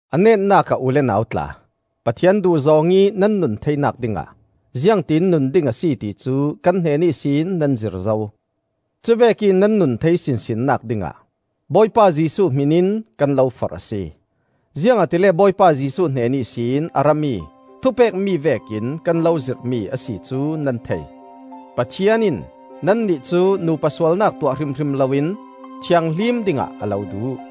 A netnak ah u le nau tla, Pathian duhzawng ih nan nun theinak dingah ziangtin nun ding a si ti cu kan hnen ihsin nan zir zo. Cuvek ih nan nun thei sinsinnak dingah Bawipa Jesuh hmin in kan lo forh a si. Ziangahtile Bawipa Jesuh hnen ihsin a rami thupekmi vekin kan lo zirhmi a si cu nan thei. Pathian in nannih cu nupa sualnak tuah hrimhrim loin thianghlim dingah a lo duh.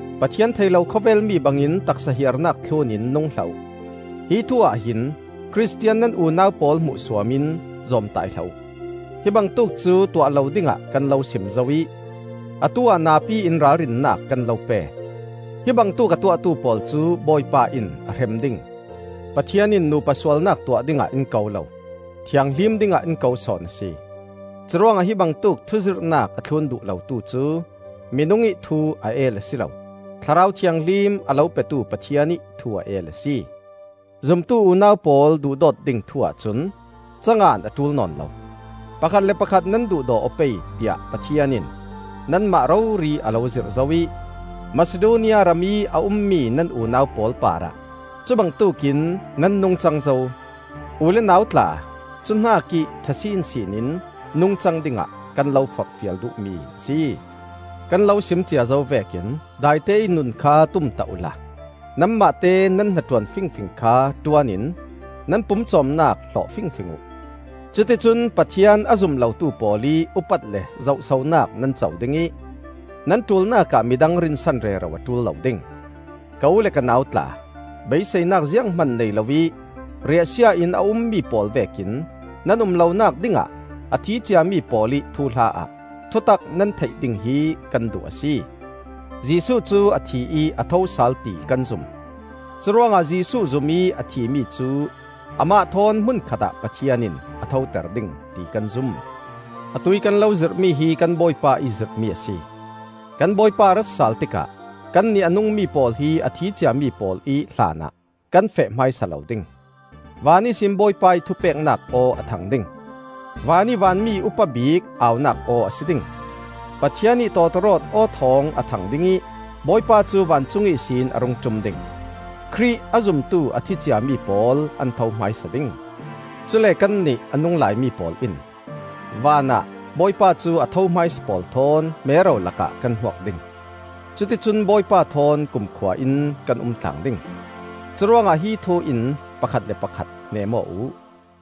Pathian thei lo khawvel mi bangin taksa hiarnak thlun in nung hlah uh. Hi thu-ah hin Khristian nan unau pawl hmuhsuam in zawmtai hlah uh. Hi bangtuk cu tuah lo dingah kan lo sim zo ih atu-ah napi in ralrinnak kan lo pe: hibangtuk a tuahtu pawl cu Bawipa in a hrem ding. Pathian in nupa sualnak tuah dingah in ko lo, thianghlim dingah in ko sawn a si. Curuangah hibangtuk thuzirhnak a thlun duh lotu cu minung ih thu a el a si lo, Thlarau Thianghlim a lo petu Pathian ih thu a el a si. Zumtu unau pawl duhdawt ding thu-ah cun ca ngan a ṭul nawn lo. Pakhat le pakhat nan duhdaw aw pei, tiah Pathian in nanmah rori a lo zirh zo ih, Masidonia ramih a ummi nan unau pawl parah cubangtuk in nan nungcang zo. U le nau tla, cu hnakih ṭha sinsin in nungcang dingah kan lo forhfial duhmi a si. Kan lo sim cia zo vekin daiteih nun kha tumtah uhla nanmahte nan hnaṭuan fingfing kha ṭuan in nan pumcawmnak hlawh fingfing uh. Cuticun Pathian a zum lotu pawl ih upat le zohsonak nan co ding ih nan ṭulnak ah midang rinsan rero a ṭul lo ding. Ka u le ka nau tla, beiseinak zianghman nei lo ih riahsia-in a ummi pawl vekin nan um lonak dingah, a thi ciami pawl ih thuhla-ah thutak nan theih ding hi kan duh a si. Jesuh cu a thi ih a thosal ti kan zum; curuangah Jesuh zum ih a thimi cu amah thawn hmun khatah Pathian in a thoter ding ti kan zum. Atuih kan lo zirhmi hi kan Bawipa ih zirhmi a si: kan Bawipa a rat sal tikah kannih a nungmi pawl hi a thi ciami pawl ih hlanah kan feh hmaisa lo ding. Van ihsin Bawipa ih thupeknak aw a thang ding, van ih vanmi upabik au-nak aw a si ding, Pathian ih tawtawrawt aw-thawng a thang ding ih Bawipa cu vancung ihsin a rung ṭum ding. Khrih a zumtu a thi ciami pawl an tho hmaisa ding; cule kannih a nunglai mi pawl in vanah Bawipa cu a tho hmaisa pawl thawn mero lakah kan hmuak ding. Cuticun Bawipa thawn kumkhua in kan umtlang ding. Curuangah hi thu in pakhat le pakhat hneem aw uh.